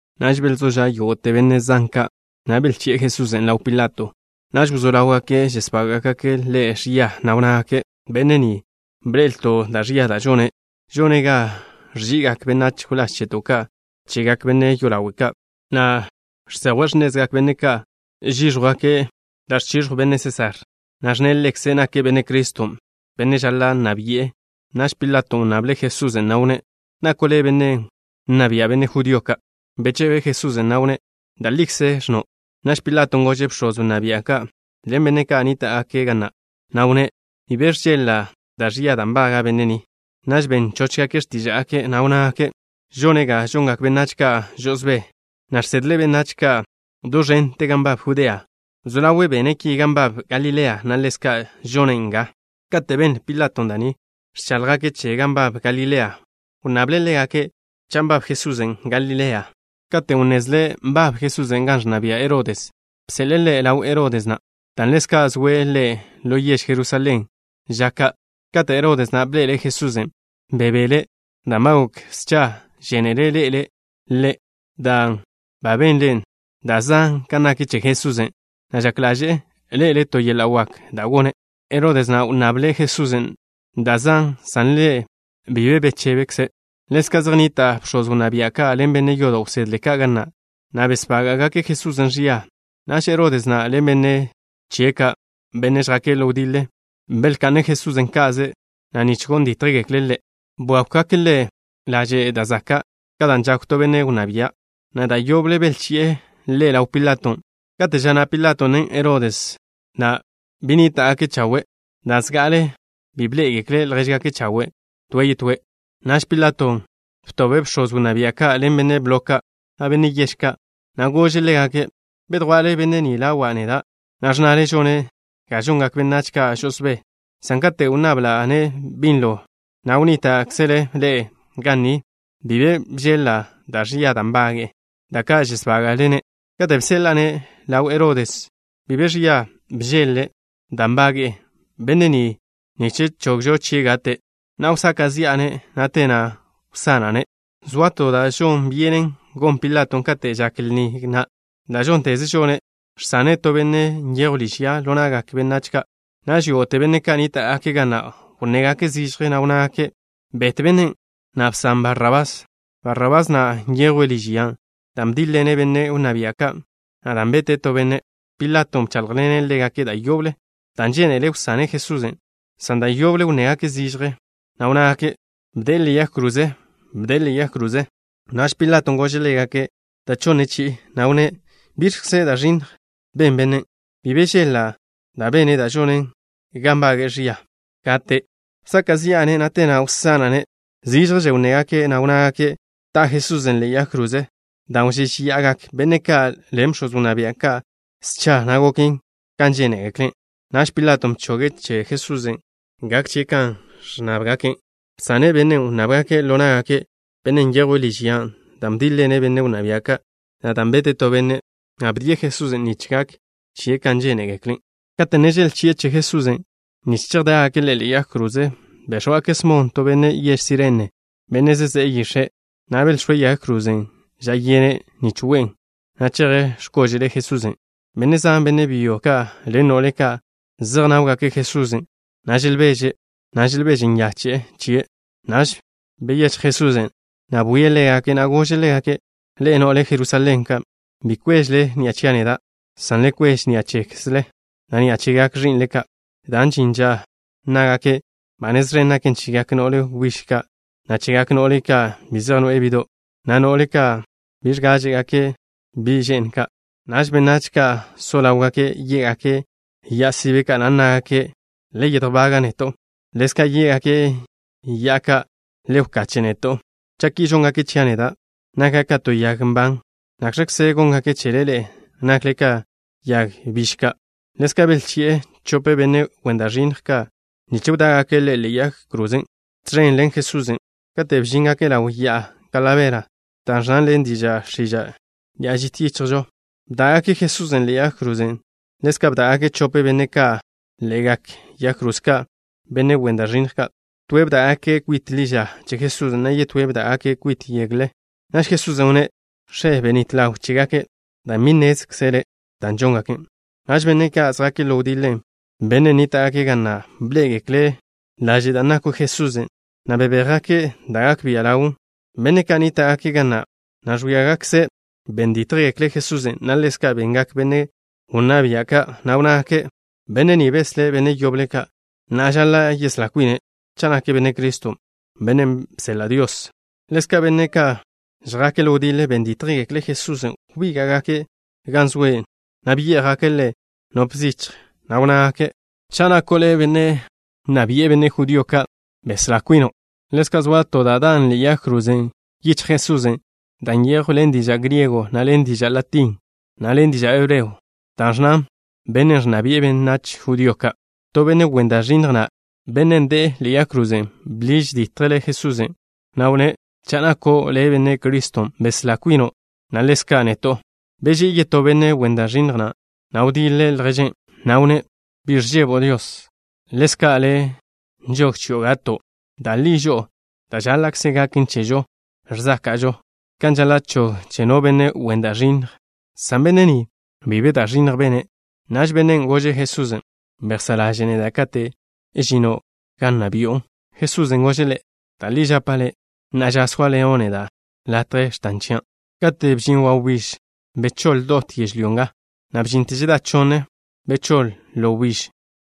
Naž belzó ža' yógo'te benne' zan ka', na' belchi'e Jesusen' ḻaw Pilato. Naž wzó ḻáwgake' žesbága'gake' Ḻe' ẕia, na' wnnágake': —Benne' ni, bḻe'elto' da' ẕia da' žone'. Žone' ga ẕži'igak benách wláž cheto' ka' chegak benne' yolawe' ka', na' žsejwe' x̱nezgak benne' ka' žíẕjwgake' da' ẕchiẕjw benne' Sésar, na' ẕnne' ḻekze' nake' Benne' Criston', benne' žaḻa' nna bi'e. Naž Pilaton' wnnable' Jesusen', na' wnné': —¿Nako' le' benne' nna bi'e benne' judío ka'? Bechebe Jesusen', na' wnné': —Da' likze ẕnno'. Naž Pilaton' gože' bx̱oz wnná bia' ka', ḻen benne' ka' nníta'gake' ga na', na' wnné': —Bi be ẕžeḻ-la' da' ẕia da' nbaga' benne' ni. Naž ben chóchgake' x̱tíža'gake', na' wnnágake': —Žone' ga žongak benách ka' žo'osbé, na' žsedle' benách ka' do ẕente gan nbab Judea. Wzó ḻawe' bene' ki gan nbab Galilea, na' ḻezka' žonen' nga. Kate' benle Pilato da' ni, ẕcháḻjgake' che gan nbab Galilea, wnnable' ḻégake' cha' nbab Jesusen' Galilea. Katen' wnnezle' nbab Jesusen' gan ẕnna bia' Herodes, bseḻe'e Ḻe' ḻaw Herodes na', dan' ḻezka' zoe' ḻe' ḻo yež Jerusalén ža ka'. Kate' Herodes na' bḻe'ele' Jesusen', bebele', dan' ba gok scha žénele' ḻe'ele' Ḻe', dan' ba benle' da' zan kan nak che Jesusen', na' žak ḻaže'e ḻe'ele' to yeḻa' wak da' gone'. Herodes na' wnnable' Jesusen' da' zan, san Ḻe' bi be bechebe'. Ḻezka' zej nnita' bx̱oz wnná bia' ka' ḻen benne' yodo' wsedle ka' ga na', na' besbága'gake' Jesusen' ẕia. Naž Herodes na' ḻen benne' chie' ka', benne' žjake' ḻo wdiḻe, belka'ne' Jesusen' ka'ze, na' nich gon dítjgekle' Ḻe', bwákwgake' Ḻe' laže' da' zaka', ka dan' žakw to benne' wnná bia', na' da' yoble belchi'e Ḻe' ḻaw Pilaton'. Kate' ža na' Pilaton', na' Herodes na' benníta'gake' chawe', dan' zga'ale bi bḻé'egekle' ljéžgake' chawe' toe' yetóe'. Naž Pilato btobe' bx̱oz wnná bia' ka' ḻen benne' blo ka', na' benne' yež ka', na' gože' ḻégake': —Bedjwa'le benne' ni ḻawa' neda', na' ẕnnale žone' ga žongak benách ka' žo'osbé, san kate' wnnabla'-ne' binlo, na' wnníta'kzele ḻe'e ga ni, bi be bžeḻ-la' da' ẕia da' nbage'e, da' ka' žesbága'le-ne'. Kate' bseḻa'a-ne' ḻaw Herodes, bi be ẕia bžeḻ-le' da' nbaga' benne' ni nich chogžo chie' gate'. Na'a wsaka' zi'a-ne', na' te na' wsana'-ne'. Zoa to da' žon byenen gon Pilaton' kate' žak lni na', da' žónteze žone', žsane' to benne' nyejwe' liž ya ḻo na'gak benách ka'. Naž yógo'te benne' ka' nníta'gake' ga na', wnnégake' zižje, na' wnnágake': —Bet bennen', na' bsan Barrabás. Barrabás na' nyejwe' liž ya dan' bdíḻ-ḻene' benne' wnná bia' ka', na' dan' bete' to benne'. Pilaton' bcháḻjḻene' ḻégake' da' yoble, dan' žénele' wsane' Jesusen', san da' yoble wnnégake' zižje, na' wnnágake': —¡Bde'e ḻe'e yag kroze! ¡Bde'e ḻe'e yag kroze! Naž Pilaton' gože' ḻégake' da' chonne chi'i, na' wnné': —¿Biẕkze da' ẕinnj ben bennen'? Bi be bžeḻ-la' da' bene' da' žonen ga nbage'e ẕia gate'. Wsaka' zi'a-ne', na' te na' wsana'-ne'. Zížježe wnnégake', na' wnnábgake' ta' Jesusen' ḻe'e yag kroze. Dan' wžéžeya'agak benne' ka' ḻen bx̱oz wnná bia' ka', scha, na' goken kan žénegekle'. Naž Pilaton' bchoge' che Jesusen' gak chie' kan ẕnnábgake'. Bsane' bennen' wnnábgake' ḻo ná'gake', bennen' nyejwe' liž ya dan' bdíḻ-ḻene' benne' wnná bia' ka', na' dan' bete' to benne', na' bdie' Jesusen' nich gak chie' kan žénegekle'. Kate' ne želchi'e Jesusen' nich chejdá'gake' Ḻe' ḻe'e yag kroze, béx̱wgake' Smon, to benne' yež Sirene, benne' zezé'e yix̱e', na' belx̱óe' yag krozen' ža yene' nich we'en, na' cheje' x̱kóže'le Jesusen'. Benne' zan, benne' byo ka' ḻen no'le ka', zejnáwgake' Jesusen', na' želbeže', na' želbeže nyache'e chie'. Naž byechj Jesusen', na' bwie' ḻégake', na' gože' ḻégake': —Ḻe'e, no'le Jerusalén ka'. Bi kwéžele ni'a chia' neda', san le kweže ni'a chekzle, na' ni'a chegak ẕi'nle ka', dan' žin ža nnágake': “Ba nez ẕen naken chegak no'le wbíž ka', na' chegak no'le ka' bi zej noe'e bi'do' ka', na' no'le ka' bi ẕgáže'gake' bi' že'n ka'.” Naž benách ka' so ḻáwgake' yé'gake' ya'a sibe ka', na' nnágake': “Le yedjbaga' neto'” na' ḻezka' yé'gake' ya'ado' ka': “Le wkache' neto'.” Cha' ki žóngake' chia' neda', naka' ka to yag nban, ¿nakx̱kze góngake' chele ḻe'e, nakle ka yag biž ka'? Ḻezka' belchi'e chope benne' wen da' ẕinnj ka', nich wdá'gake' ḻégake' ḻe'egak yag kroze ka' tẕen ḻen Jesusen'. Kate' bžíngake' ḻaw Ya'a Kalabera, da' ẕnnan ḻen diža' x̱iža': “Ya'a Žit Yichjžo” bdá'gake' Jesusen' ḻe'e yag kroze. Ḻezka' bdá'gake' chope benne' ka' ḻe'egak yag kroze ka', benne' wen da' ẕinnj ka'. Toe' bdá'gake' kwit ḻi ža che Jesusen', na' yetóe' bdá'gake' kwite' yegle. Naž Jesusen' wnné': —X̱e, benít ḻaw chégake', dan' bi nnézgekle' da' žóngake'. Naž benne' ka' žjake' ḻo wdiḻe, benne' nníta'gake' ga na', belé'egekle' ḻaže' dan' nakw Jesusen', na' bebéjgake' da' gak bia' ḻawlen. Benne' ka' nníta'gake' ga na', na' ẕwíagakze', ben dítjgekle' Jesusen', na' ḻezka' bengak benne' wnná bia' ka', na' wnnágake': —Benne' ni beslé' benne' yoble ka'. Na'a žaḻa' yeslá kwine' cha' nake' Benne' Criston', bennen' bseḻa' Dios. Ḻezka' benne' ka' žjake' ḻo wdiḻe ben dítjgekle' Jesusen'. Wbíga'gake' gan zoe', na' byé'jgake' Ḻe' nop zichj, na' wnnágake': —Cha' nako' le' benne' nna bi'e benne' judío ka', beslá kwino'. Ḻezka' zoa to da' dan' ḻe'e yag kroze yichjle Jesusen', da' nyejwn ḻen diža' griego, na' ḻen diža' latín, na' ḻen diža' hebreo, dan' ẕnnan: “Benne' ẕnna bi'e benách judío ka'.” To benne' wen da' ẕinnj na', benne' de'e ḻe'e yag kroze, bḻiž ditje' Jesusen', na' wnné': —Cha' nako' le' Benne' Criston', beslá kwino', na' ḻezka' neto'. Beží'i yetó benne' wen da' ẕinnj na', na' wdiḻe' lježen', na' wnné': —¿Bi ẕžebo' Dios? Ḻezka' le' nžog chio' gato'. Da' li žo'o, da' žáḻa'kze gaken chežo ẕzáka'žo, kan žaḻa' chog che no benne' wen da' ẕinnj, san benne' ni, bi be da' ẕinnj bene'. Naž bennen' gože' Jesusen': —Bejsá' ḻaže' neda' kate' žino' gan nna bi'o. Jesusen' gože' ḻe': —Da' li žapa' le', na'a ža sóaḻeno' neda' latje x̱tan chia'. Kate' bžin wawbíž, bechóḻ dot yežlyó nga ga bžinte žedá chonne. Bechóḻ ḻo wbíž,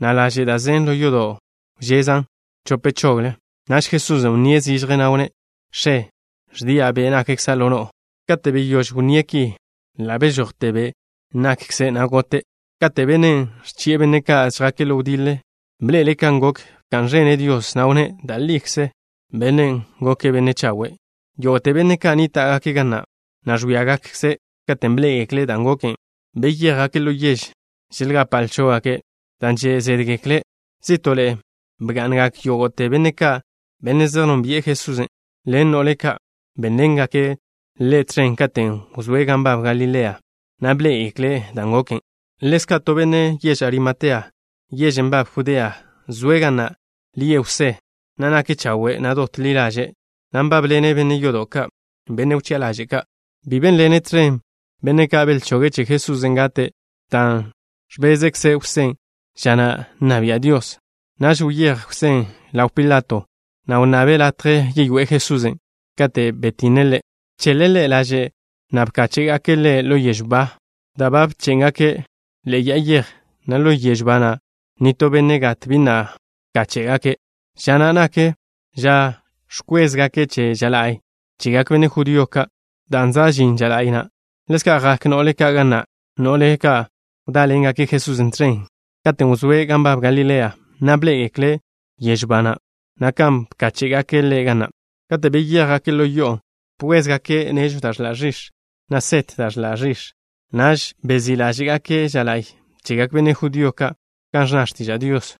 na' laže' da' zen ḻo yodo' wžezan' chope chogle. Naž Jesusen' wnníe' zižje, na' wnné': —X̱e, ẕdia' be' nakkza' ḻo no'o. Kate' beyóž wnné' ki, ḻa' bežojte be' nakkze', na' gote'. Kate' bennen' ẕchi'e benne' ka' žjake' ḻo wdiḻe bḻe'ele' kan goken, bka'n ẕene' Dios, na' wnné': —Da' likze bennen' goke' benne' chawe'. Yógo'te benne' ka' nníta'gake' ga na', na' ẕwíagakze', katen' bḻé'egekle' dan' goken, beyéjgake' ḻo yež, želgapa' lchó'gake' dan' že' zédgekle'. Zí'to'le bga'ngak yógo'te benne' ka', benne' zej nónbi'e Jesusen', ḻen no'le ka' bénḻengake' Ḻe' tẕen katen' wzóe' gan nbab Galilea, na' bḻé'egekle' dan' goken. Ḻezka' to benne' yež Arimatea, yežen' nbaben Judea, zoe' ga na'. Lie' Jwsé, na' nake' chawe', na' dot ḻi ḻaže', na' nbábḻene' benne' yodo' ka', benne' wchi'a ḻaže' ka'. Bi bénḻene' tẕen benne' ka' belchoge' che Jesusen' gate', dan' ẕbezkze Jwsén' ža na' nna bia' Dios. Naž wyéj Jwsén' ḻaw Pilato, na' wnnabe' latje yeyoé'e Jesusen'. Kate' ba betinne' Ḻe', bcheḻe' Ḻe' laže', na' bkáche'gake' Ḻe' ḻo yežw ba, da' ba bché'ngake' ḻe'e ya'a yej, na' ḻo yežw ba na', nitó benne' gat bi na' wkáche'gake'. Ža na' nak ža ẕkwézgake' che ža la'y chegak benne' judío ka', dan' za' žin ža la'y na'. Ḻezka' jak no'le ka' ga na', no'le ka' wdáḻengake' Jesusen' tẕen, katen' wzóe' gan nbab Galilea, na' bḻé'egekle' yežw ba na', na' kan bkáche'gake' Ḻe' ga na'. Kate' beyéjgake' ḻo yo'o, bkwézgake' nežw da' ẕḻa' ẕix̱, na' set da' ẕḻa' ẕix̱. Naž bezí' ḻáže'gake' ža la'y chegak benne' judío ka', kan ẕnna x̱tiža' Dios.